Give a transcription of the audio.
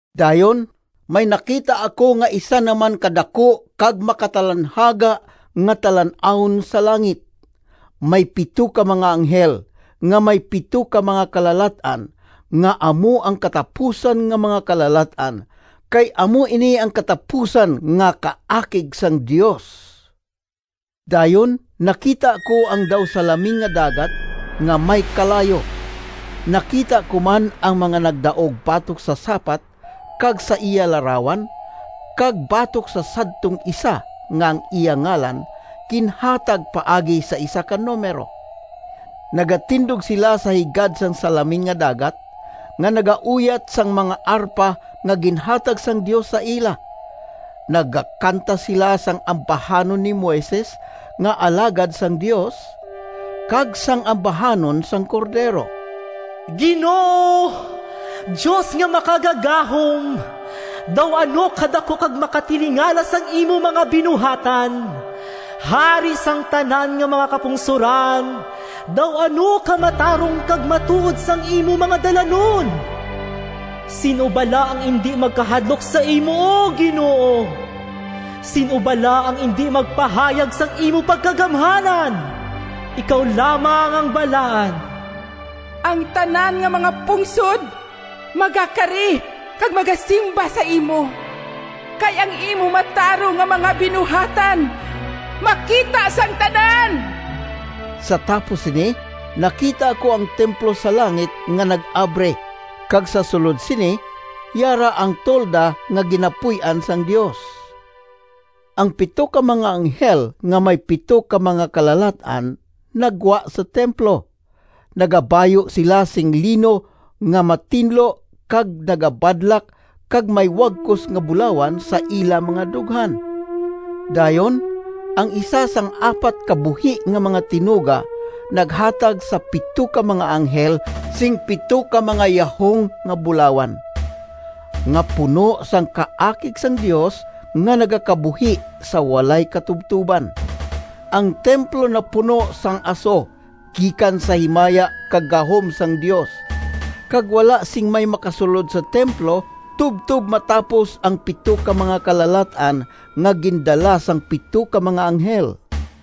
Dayon may nakita ako nga isa naman ka daku kag makatalanhaga nga talan-awon sa langit. May pito ka mga anghel nga may pito ka mga kalalat-an, nga amo ang katapusan nga mga kalalat-an, kay amo ini ang katapusan nga kaakig sang Dios. Dayon nakita ko ang daw salaming nga dagat nga may kalayo. Nakita ko man ang mga nagdaog batok sa sapat kag sa iya larawan, kag batok sa sadtong isa nga ang iya ngalan ginhatag paagi sa isa ka numero. Nagatindog sila sa higad sang salaming nga dagat, nga nagauyat sang mga arpa nga ginhatag sang Dios sa ila. Nagakanta sila sang ambahanon ni Moises nga alagad sang Dios, kag sang ambahanon sang Cordero: “Ginoo, Dios nga Makagagahom, Daw ano kadaku kag makatilingala Sang imo mga binuhatan! Hari sang tanan Nga mga kapungsoran, Daw ano ka matarong Kag matuod sang imo mga dalanon! Sin-o bala ang indi magkahadlok Sa imo, O Ginoo? Sin-o bala ang indi magpahayag Sang imo pagkagamhanan? Ikaw lamang ang balaan. Ang tanan nga mga pungsod Magakari kag magasimba sa imo, Kay ang imo matarong Nga mga binuhatan Makita sang tanan.” Sa tapos sini nakita ko ang templo sa langit nga nag-abri, kag sa sulod sini yara ang tolda nga ginapuy-an sang Dios. Ang pito ka mga anghel nga may pito ka mga kalalat-an naggwa sa templo. Nagabayu sila sing lino nga matinlo kag nagabadlak kag may wagkos nga bulawan sa ila mga dughan. Dayon ang isa sang apat ka buhi nga mga tinuga naghatag sa pito ka mga anghel sing pito ka mga yahong nga bulawan, nga puno sang kaakig sang Dios nga nagakabuhi sa walay katubtoban. Ang templo napuno sang aso gikan sa himaya kag gahom sang Dios, kag wala sing may makasulod sa templo tubtob matapos ang pito ka mga kalalat-an nga gindala sang pito ka mga anghel.